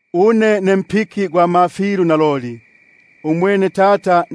Une ne mpiki gwa mafilu ugwa naloli, umwene Tata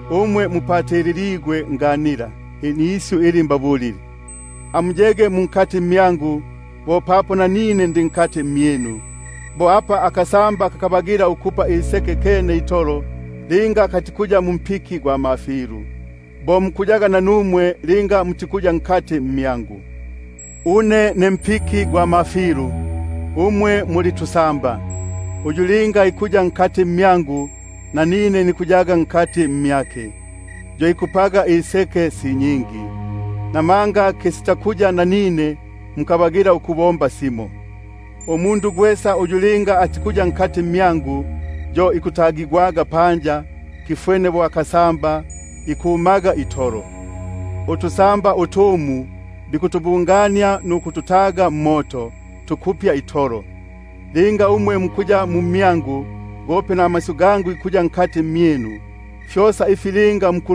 Umwe mupatililigwe nganila nisyu ili mbabulile. Amuyege mu mmyangu, bo papo nanine ndi mmyinu. Bo apa akasamba kakabagila ukupa iseke kene itolo linga katikuya mumpiki gwa mafilu, bo mukuyaga nanumwe linga mutiku- yamo mmyangu. Une ne mpiki gwa mafilu, umwe muli tusamba. Uyu linga ikuya mu mmyangu, nanine nikuya mu mmyake, yo ikupaga iseke si nyingi; namanga kisitakuya nanine, mukabagila ukubomba nasimo. Linga yumo atikuya mu mmyangu, yo ikutagigwa panja bo akasamba, ikumaga itolo; utusamba utumu bikutubungania nukututaga mmoto, tukupya itolo. Linga umwe mukuya mu mmyangu, gope namasyu gangu gikuya mu mmyinu, fyosa ifi linga muku-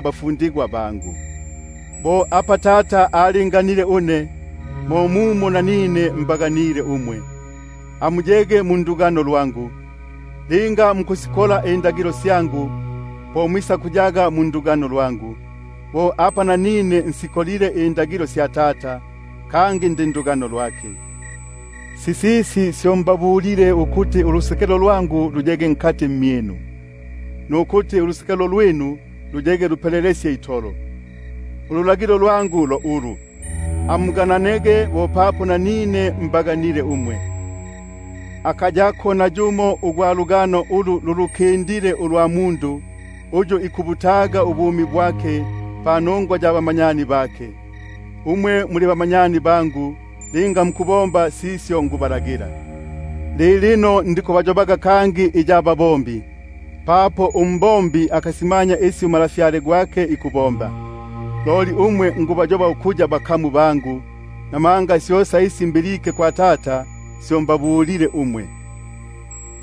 bafundigwa bangu. Bo apa Tata alinganile une, mo mumo nanine nabaganile umwe; amuyege mu ndugano lwangu. Linga mukusikonga indagilo syangu, po mwisakuyaga mu ndugano lwangu; bo apa nanine nsikongile indagilo sya Tata, kangi ndi ndugano lwake. Sisisi syo mbabulile ukuti ulusekelo lwangu luyege mmyinu, nukuti ulusekelo lwinu luyege lupelelesye itolo. Ululagilo lwangu lo ulu: Amugana- nege bo papo nanine mbaganile umwe. Akayako nayumo ugwa lugano ulu lulukindile ulwa mundu, uyu ikubutaga ubumi bwake panongwa ya bamanyani bake. Umwe muli bamanyani bangu, linga mukubomba sisyo nikubalagila. Lilino ndikubayobaga kangi iya butumwa, papo untumwa akasimanya isi umalafyale gwake ikubomba; loli umwe nikubayoba ukuya bamanyani bangu, buno syosa isi mbilike kwa Tata syo mbabulile umwe.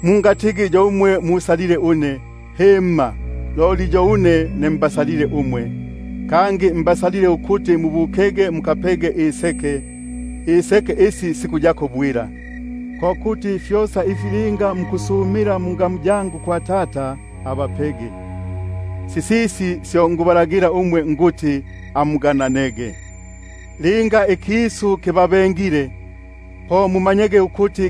Mungatigi yo umwe musalile une, himma, loli yo une ne mbasalile umwe, kangi mbasalile ukuti mubukege mukapege iseke, iseke isi sikuyako bwila; ko kuti fyosa ifi linga mukusumila kwa Tata mungamu yangu, abapege. Sisisi syo nikubalagila umwe ukuti amugananege. Linga ikisu kibabengile umwe, po mumanyege ukuti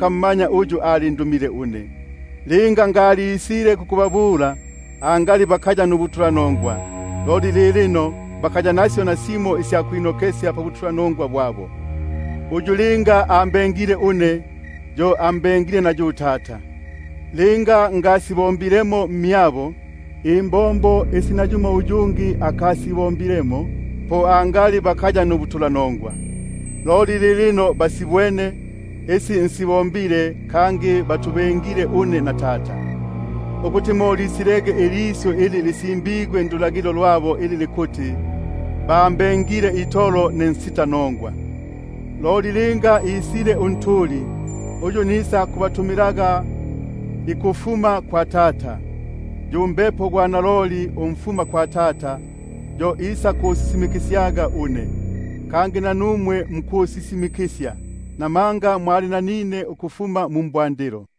mmanya uyu alindumile une. Linga ngalisile kukubabula, angali bakaya nubutulanongwa, loli lilino bakaya nasyo nasimo isya kwinokesya pabutulanongwa bwabo. Uyu linga ambe- ngile une, yo ambengile na yu Tata. Linga ngasibombilemo mmyabo imbombo isi nayumo uyungi akasibombilemo, po angali bakaya nubutulanongwa; loli lilino batubwene, kangi batubengile une na Tata; ukuti mo lisilege ilisyu ili lisimbigwe ndulagilo lwabo, ili likuti: Bambengile itolo ne nsitanongwa. Loli linga isile Unjili, uyu nisakubatumilaga ukufuma kwa Tata, yu Mbepo gwa naloli umfuma kwa Tata, yo isakusisimi- kisyaga une. Kangi nanumwe mukusisimikisya, namanga mwali nanine ukufuma mu mbwandilo.